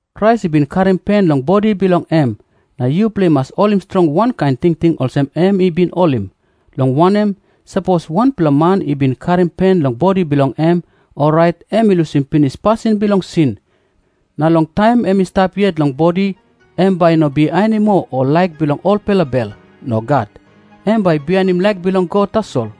Krais i bin karim pen long bodi bilong em, na yupela i mas holim strong wankain tingting olsem em i bin holim. Long wanem, sapos wanpela man i bin karim pen long bodi bilong em, orait em i lusim pinis pasin bilong sin. Na long taim em i stap yet long bodi, em bai i no bihainim moa ol laik bilong olpela bel. Nogat. Em bai bihainim laik bilong God tasol.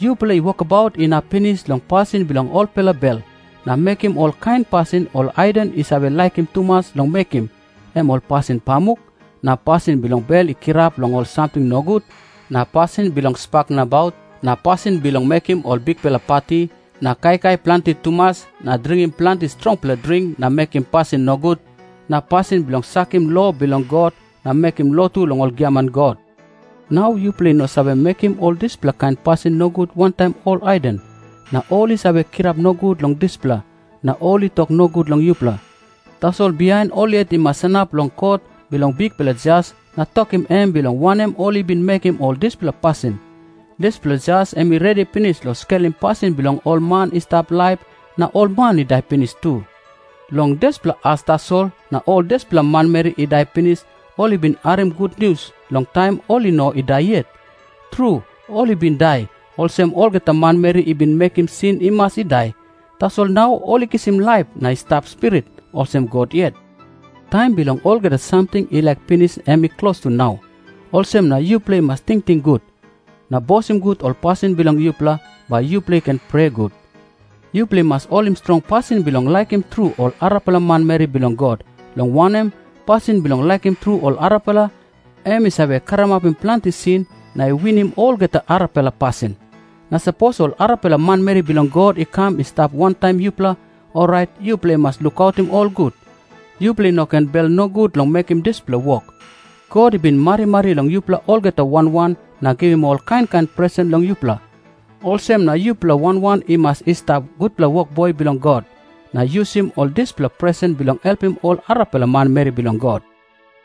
Yupela i wokabaut inap pinis long pasin bilong olpela bel, na mekim olkain pasin ol haiden i save laikim tumas long mekim, em ol pasin pamuk, na pasin bilong bel i kirap long ol samting nogut, na pasin bilong spak nabaut, na pasin bilong mekim ol bikpela pati na kaikai planti tumas na dringim planti strongpela dring na mekim pasin nogut, na pasin bilong sakim lo bilong God na mekim lotu long ol giaman god. Nau yupela i no save mekim ol dispela kain pasin nogut wantaim ol haiden. Na ol i save kirap nogut long dispela, na ol i tok nogut long yupela. Tasol bihain ol yet i mas sanap long kot bilong bikpela Jas na tokim em bilong wanem ol i bin mekim ol dispela pasin. Dispela Jas em i redi pinis long skelim pasin bilong ol man i stap laip na ol man i dai pinis tu. Long dispela as tasol na ol dispela manmeri i dai pinis ol i bin harim gutnius long taim ol i no i dai yet. Tru, ol i bin dai, olsem olgeta manmeri i bin mekim sin i mas i dai, tasol nau ol i kisim laip na i stap spirit, olsem God yet. Taim bilong olgeta samting i laik pinis em i klostu nau. Olsem na yupela i mas tingting gut, na bosim gut ol pasin bilong yupela, bai yupela i ken prea gut. Yupela i mas holim strong pasin bilong laikim tru ol arapela manmeri bilong God, long wanem, pasin bilong laikim tru ol arapela, em i save karamapim planti sin na i winim olgeta arapela pasin. Na sapos ol arapela manmeri bilong God i kam i stap wantaim yupela, orait yupela i mas lukautim ol gut. Yupela i no ken bel nogut long mekim dispela wok. God i bin marimari long yupela olgeta wan wan na givim ol kain kain presen long yupela. Olsem na yupela wan wan i mas i stap gutpela wokboi bilong God, na yusim ol dispela presen bilong helpim ol arapela manmeri bilong God.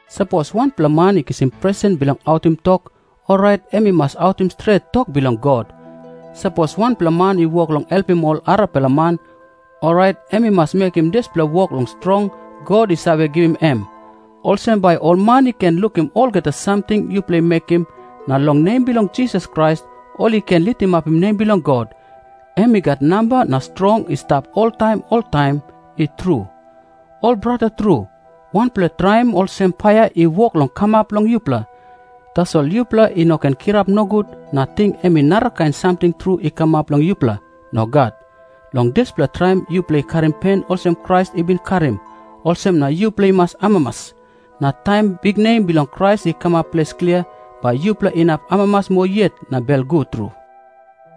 Sapos wanpela man i kisim presen bilong autim tok, orait em i mas autim stret tok bilong God. Sapos wanpela man i wok long helpim ol arapela man, orait em i mas mekim dispela wok long strong God i save givim em. Olsem bai ol man i ken lukim olgeta samting yupela i mekim, na long nem bilong Jisas Krais ol i ken litimapim nem bilong God. Em i gat namba na strong i stap oltaim oltaim. I tru. Ol brata tru, wanpela traim olsem paia i wok long kamap long yupela. Tasol yupela i no ken kirap nogut na ting em i narakain samting tru i kamap long yupela. Nogat. Long dispela traim yupela i karim pen olsem Krais i bin karim, olsem na yupela i mas amamas. Na taim biknem bilong Krais i kamap ples klia, bai yupela inap amamas moa yet na belgut tru.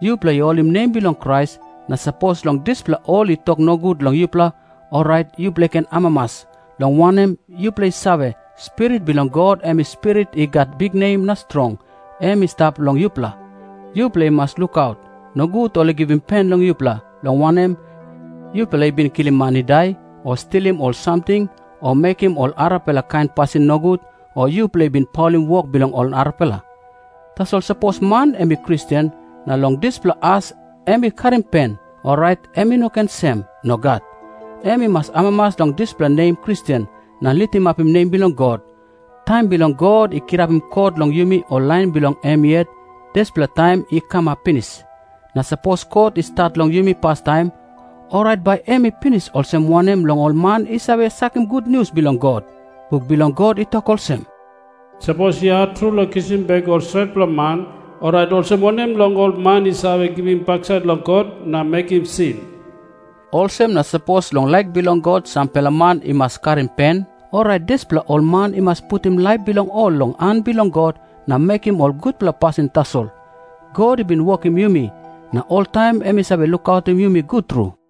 Yupel a i holim nem bilong Krais, na sapos long dispela ol i tok nogut long yupela, orait yupela i ken amamas. Long wanem, yupela i save, Spirit bilong God, em Spirit i gat biknem na strong, em i stap long yupela. Yupela i mas lukaut, nogut ol i givim pen long yupela, long wanem, yupela i bin kilim man i dai o stilim ol samting o mekim ol arapela kain pasin nogut o yupela i bin paulim wok bilong ol arapela. Tasol sapos man em i Kristen, na long dispela as em i karim pen, orait em i no ken sem. Nogat. Em i mas amamas long dispela nem Kristen, na litimapim nem bilong God. Taim bilong God i kirapim kot long yumi ol lain bilong em yet, dispela taim i kamap pinis. Na sapos kot i stat long yumi pastaim, orait bai em i pinis olsem wanem long ol man i save sakim gutnius bilong God? Buk bilong God i tok olsem, "Sapos i hat tru long kisim bek ol stretpela man, orait olsem wanem long ol man i save givim baksait long God na mekim sin?" Olsem na sapos long laik bilong God sampela man i mas karim pen, orait dispela ol man i mas putim laip bilong ol long han bilong God na mekim ol gutpela pasin tasol. God i bin wokim yumi, na oltaim em i save lukautim yumi gut tru.